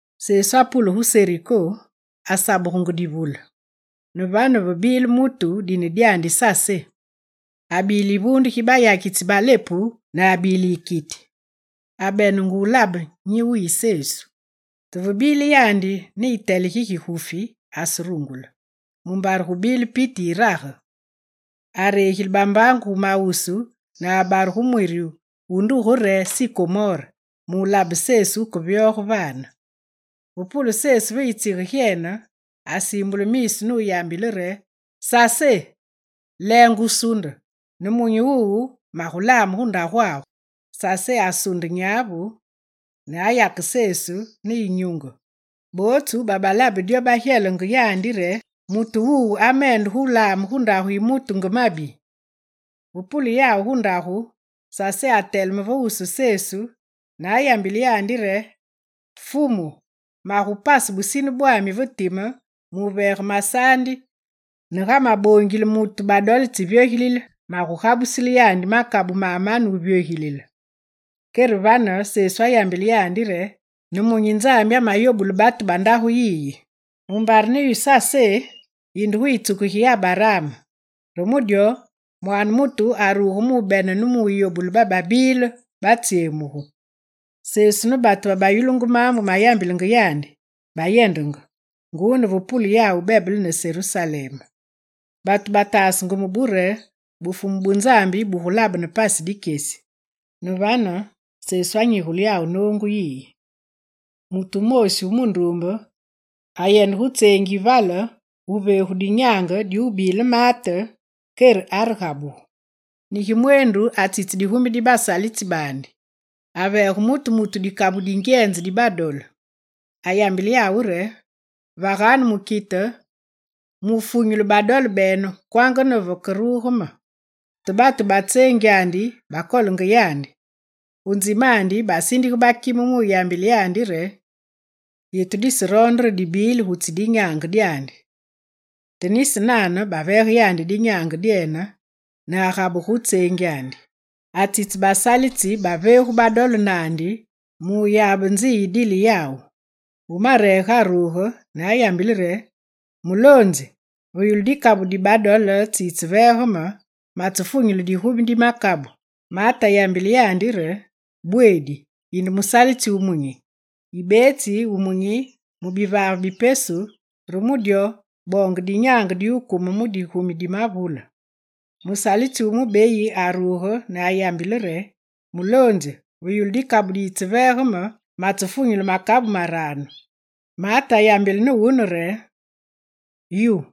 Sesu apule gu Seriko, asabugenge divule. Ne vane, vebile mutu dine dyandi Sasé. Abile yivuunde gi bayakitsi ba lepu ne abile yikiti. Abenenge wulabe nyi wubile Sesu. Te ve bile yandi ne yitele gi gigufi aserungule, mumbare gubile piti yirage. Aregile bambaangu gu mawusu ne abare gu mwiri wu nduge re, sikomore mu wulabe Sesu wukevyoge vane. Ve pule Sesu ve yitsige gyena, asiimbule miisu nuyambile naandi re: «Sasé, leenge wusuunde ne munyi wuwu magulame gu ndagwagu!» Sasé asunde nyavu nuyake Sesu ne yinyunge. Bootsu babalabe dyo, ba gyelenge yandi re: «Mutu wuwu amende laame gu ndagu yi mutu nge mabi!» Ve pule yawu gu ndagu, Sasé ateleme ve wusu Fumu ne ayambile yandi re: «Fumu magupase busine bwami ve time muveege masaandi ne ga maboongile mutu badole tsi vyogilile, magugabusile yandi makabu mamane vuvyogilile.» Kere vane Sesu ayambile yandi re: «Ne munyi Nzambi ameyobule batu ba ndagu yiyi, mumbare ne yu Sasé, yinde gu yitsuku gi Abaraam! Re mu dyo, Mwaane mutu aruge mubene ne muyobule bababile batsyemugu.» Sesu ne batu babayulungu maambu mayambilenge yandi bayendenge, nguu ne vepule yawu bebele ne Serusalem. Batu bataasenge mubu re Bufumu bu Nzambi bugulabene pasi dikyesi. Ne vane, Sesu anyigule yawu noongu yiyi: «Mutu wumoosi wu munduumbe ayende gu tseengi yi vale gu veegu dinyaange di wubile maate, kere aregabugu. Negi mweendu, atsitse digumi di basalitsi baandi. Aveege mutu mutu dikabu di ngyenze dibadole. Ayambile yawu re: “Vaganu mukite mu funyule badole bene kwanga ne vakeruge me.” Te batu ba tseengyandi bakolenge yandi; gu nzimandi basindige bakime mu yambile yandi re: “Yetu diseroonde re dibili gutsi dinyaange dyandi.” Te nisi nane baveege yandi dinyaange dyene ne agabugu gu tseengyandi. Atsitsise basalitsi babaveegu badole naandi muyabe nzi yidile yawu. Wu mareege aruge ne ayambile re: “Muloonzi, ve yulu dikabu dibadole tsiyiveege me, matsefunyule digumi di makabu.” Maate ayambile yandi re: “Bweedi, yinde musalitsi wumunyi. Yibetsi wumunyi mu bivaave bi pesu, re mu dyo boonge dinyaange di wukume mu digumi di mavule.” Musalitsi wu mubeyi aruge ne ayambile re: “Muloonzi, ve yulu dikabu diyiveege me matsefunyule makabu maranu.” Maate ayambile ne wune re: “Yu,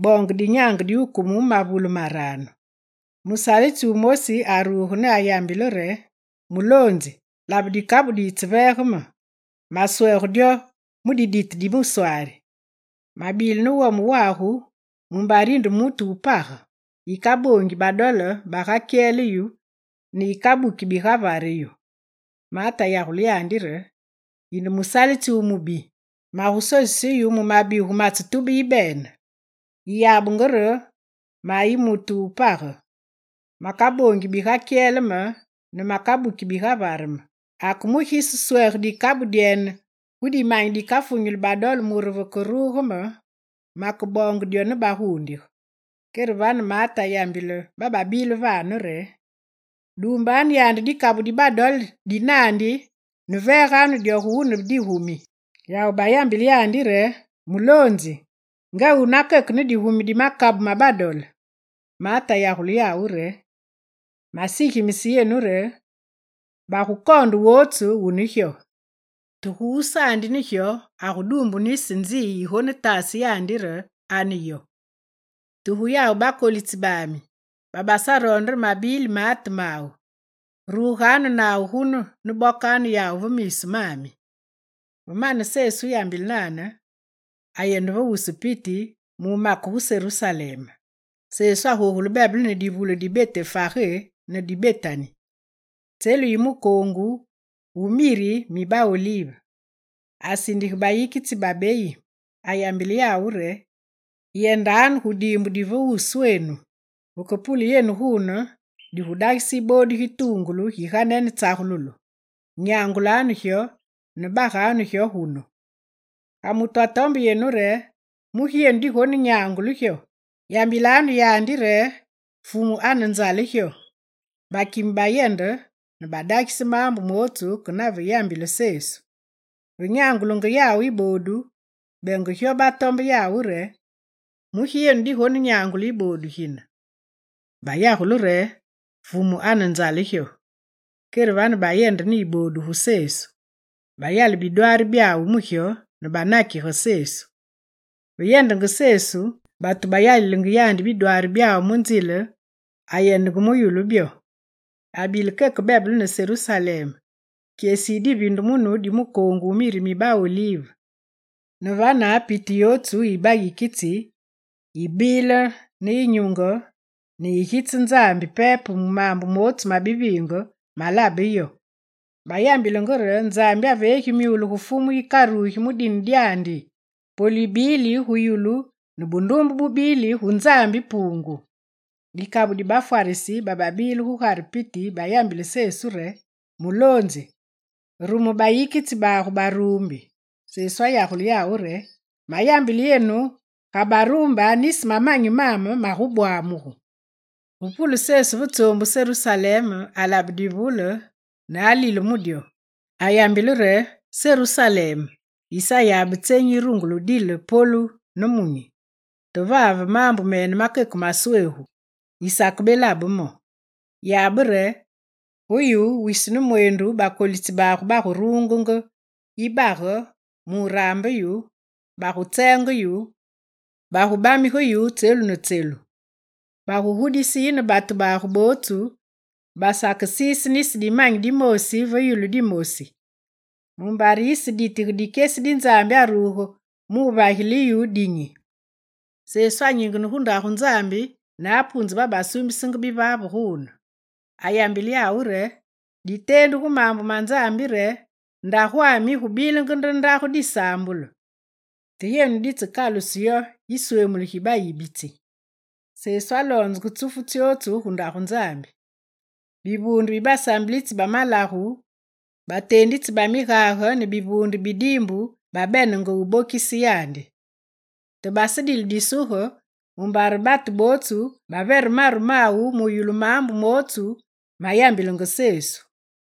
boonge dinyaange di wukume mu mavule maranu.” Musalitsi wumosi aruge ne ayambile re: “Muloonzi, labe dikabu diyiveege me, masweege dyo mu didite di muswari. Mabile ne wome wagu mumbare yinde mutu wu page: Yikaboongi badole bagakyele yu ne yikabuki bigavare yu.” Maate ayagule yandi re: “Yinde musalitsi wu mubi, magusosise yu mu mabigu matsetube yibene. Yiyabenge re mayi mutu wu page, makaboongi bigakyele me ne makabuki bigavare me. Ake mugi yiseswege dikabu dyene gu dimanyi dikafunyuli badole mure ve keruge me makeboonge dyo ne bagundige?” Kere vane maate ayambile bababile vane re: “Duumbanu yandi dikabu di badole di naandi ne veeganu dyo gu wune digumi.” Yawu bayambile yandi re: “Muloonzi, nga wune akeke ne digumi di makabu ma badole!” Maate ayagule yawu re: “Masigimise yenu dyo re, bagukoonde wotsu wune gyo; te gu wusaandi ne gyo aguduumbu nisi ma nzi yigonetase yandi re ane yo. Te gu yawu bakolitsi bami, babasaroonde re mabili maate mawu, ruganu nawu gunu ne bokanu yawu ve miisu mami.”» Ve mane Sesu wuyambile nane, ayende ve wusu piti mu wumake gu Serusalem. Sesu agogule bebele ne divule di Betefage ne di Betani, tselu yi mukoongu wu miri mi ba olive. Asindige bayikitsi babeyi. Ayambile yawu re: «Yendanu gu diimbu di ve wuswenu. Veke pule yenu gune, digudagise yiboodu gituungulu gi ganene tsagululu. Nyangulanu gyo ne baganu gyo gunu. Ga mutu atombe yenu re: “Mugi yenu digonenyangule gyo?”, yambilanu yandi re: “Fumu anenzale gyo.”» Bakime bayende ne badagise maambu mootsu ke nave yambile Sesu. Ve nyangulenge yawu yibodu, benge gyo batombe yawu re: «Mugi yenu digonenyangule yiboodu gine?» Bayagule re: «Fumu anenzale gyo.» Kere vane bayende ne yiboodu gu Sesu. Bayale bidwaari byawu mu gyo ne banakige Sesu. Ve yendenge Sesu, batu bayalilenge yandi bidwaari byawu mu nzile, ayendenge mu yulu byo. Abile keke bebele ne Serusalem, kyesi yi diviindumunu di mukoongu wu miri mi ba olive. Ne vane, piti yotsu yi bayikitsi baandi babile ne yinyunge ne bagitse Nzambi pepe mu maambu mootsu mabiviinge malabe yawu. Bayambilenge re: «Nzambi aveegi myule gu Fumu yikarugi mu dine dyandi! Polu yibili gu yulu ne bunduumbe bubili gu Nzambi Puungu!» Dikabu di bafwarisi bababile gugare piti bayambile Sesu re: «Muloonzi, rume bayikitsi bagu baruumbi.» Sesu ayagule yawu re: «Mayambile yenu ga baruumbe, nisi mamanyi magubwamugu!» Ve pule Sesu ve tsoombu Serusalem alabe divule ne alile mu dyo. Ayambile re: «Serusalem, yisayabe tsenyi yirungule wudile polu ne munyi! Te vave, maambu mene makemasweegu yisakebelabe mo! Yabe re, gu yu, wisi ne mweendu bakolitsi bagu baguruunge yibage mu wuraambe yu, bagutseenge yu, bagubamige yu tselu ne tselu. Bagugudise yine batu bagu bootsu, basake siise nisi dimanyi dimoosi va yulu dimosi, mumbare yiseditige dikyesi di Nzambi aruge mu wuvagile yu dinyi.» Sesu anyingene gu Ndagu Nzambi ne apuunze babasuumbisenge bivaave guune. Ayambile yawu re: «Diteendu gu maambu ma Nzambi re: “Ndagwami yigubilenge nde Ndagu disaambulu.” Te yenu dimakaluse yo yisweemulu gi bayibitsi!» Sesu aloonzenge tsufu tsyotsu gu Ndagu Nzambi. Bivuunde bi basaambilitsi ba malagu, bateenditsi ba migage ne bivuunde bi diimbu babenenge wubokise yandi. Te basedile disuge mumbare batu bootsu bavere maru mawu muyulu maambu mootsu ma yambilenge Sesu.